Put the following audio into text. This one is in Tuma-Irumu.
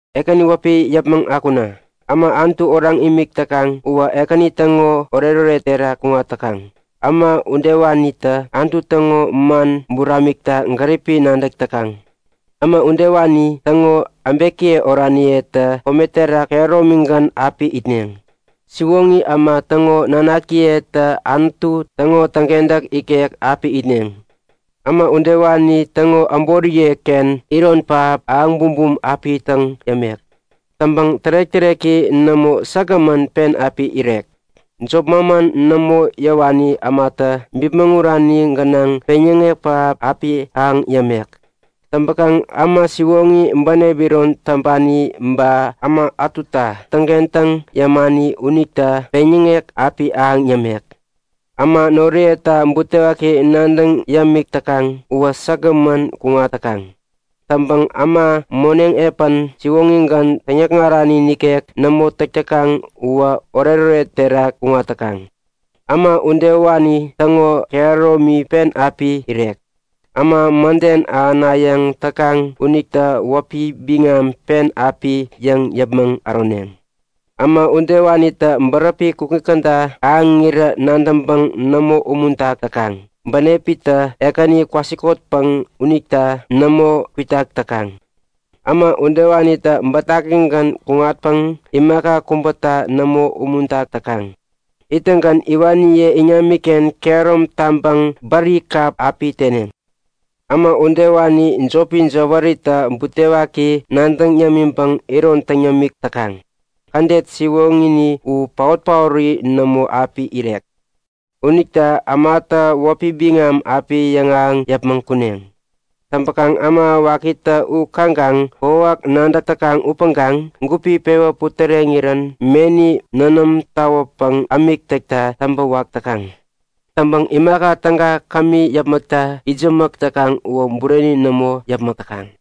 Ekäni wäpi yäpmäŋ akuna! Äma Anutu oraŋ imik täkaŋ uwä Ekäni täŋo oretoret terak kuŋat täkaŋ. Äma udewanitä Anutu täŋo man buramikta gäripi nadäk täkaŋ. Äma udewani täŋo äbekiye oraniyetä kome terak kehäromigän api itneŋ. Siwoŋi äma täŋo nanakiyetä Anutu täŋo täŋkentäk ikek api itneŋ. Äma udewani täŋo äboriyeken iron pähap ahäŋ bumbum api täŋ yämek. Täŋpäŋ tärek-täreki nämo, säkgämän pen api irek. Jop manman nämo yäwani ämata bipmäŋurani gänaŋ peŋyäŋek pähap api ahäŋ yämek. Täŋpäkaŋ äma siwoŋi, bänep iron täŋpani ba äma ätuta täŋkentäŋ yämani unita peŋyäŋek api ahäŋ yämek. Äma noriyeta butewaki nadäŋ yämik täkaŋ uwä säkgämän kuŋat täkaŋ. Täŋpäŋ äma moneŋ epän siwoŋigän, täŋyäkŋarani nikek nämo täk täkaŋ uwä oretoret terak kuŋat täkaŋ. Äma udewani täŋo kehäromi pen api irek. Äma mäden ahänayäŋ täkaŋ unitä wäpi biŋam pen api yäŋ yäpmäŋ äroneŋ. Äma udewanitä bäräpi kukŋi käda ahäŋirän nadäŋpäŋ nämo umuntak täkaŋ. Bänepitä Ekäni kwasikotpäŋ unita nämo kwitak täkaŋ. Äma udewanitä bätakigän kuŋatpäŋ imaka kubäta nämo umuntak täkaŋ. Ittäŋgän iwaniye iŋamiken kehärom taŋpäŋ bäri kap api teneŋ. Äma udewani jopi jäwärita butewaki nadäŋ yämiŋpäŋ iron täŋ yämik täkaŋ. Kädet siwoŋini u paot-paori nämo api irek. Unita ämatä wäpi biŋam api yäŋahäŋ yäpmäŋ kuneŋ. Täŋpäkaŋ äma wakitä u kaŋkaŋ kokwawak nadäk täkaŋ upäŋkaŋ gupi pewä putäreŋirän meni nänäm tawäpäŋ ämik täkta täŋpäwak täkaŋ. Täŋpäŋ imaka täga kämi yäpmäkta itsämäk täkaŋ uwä bureni nämo yäpmäk täkaŋ.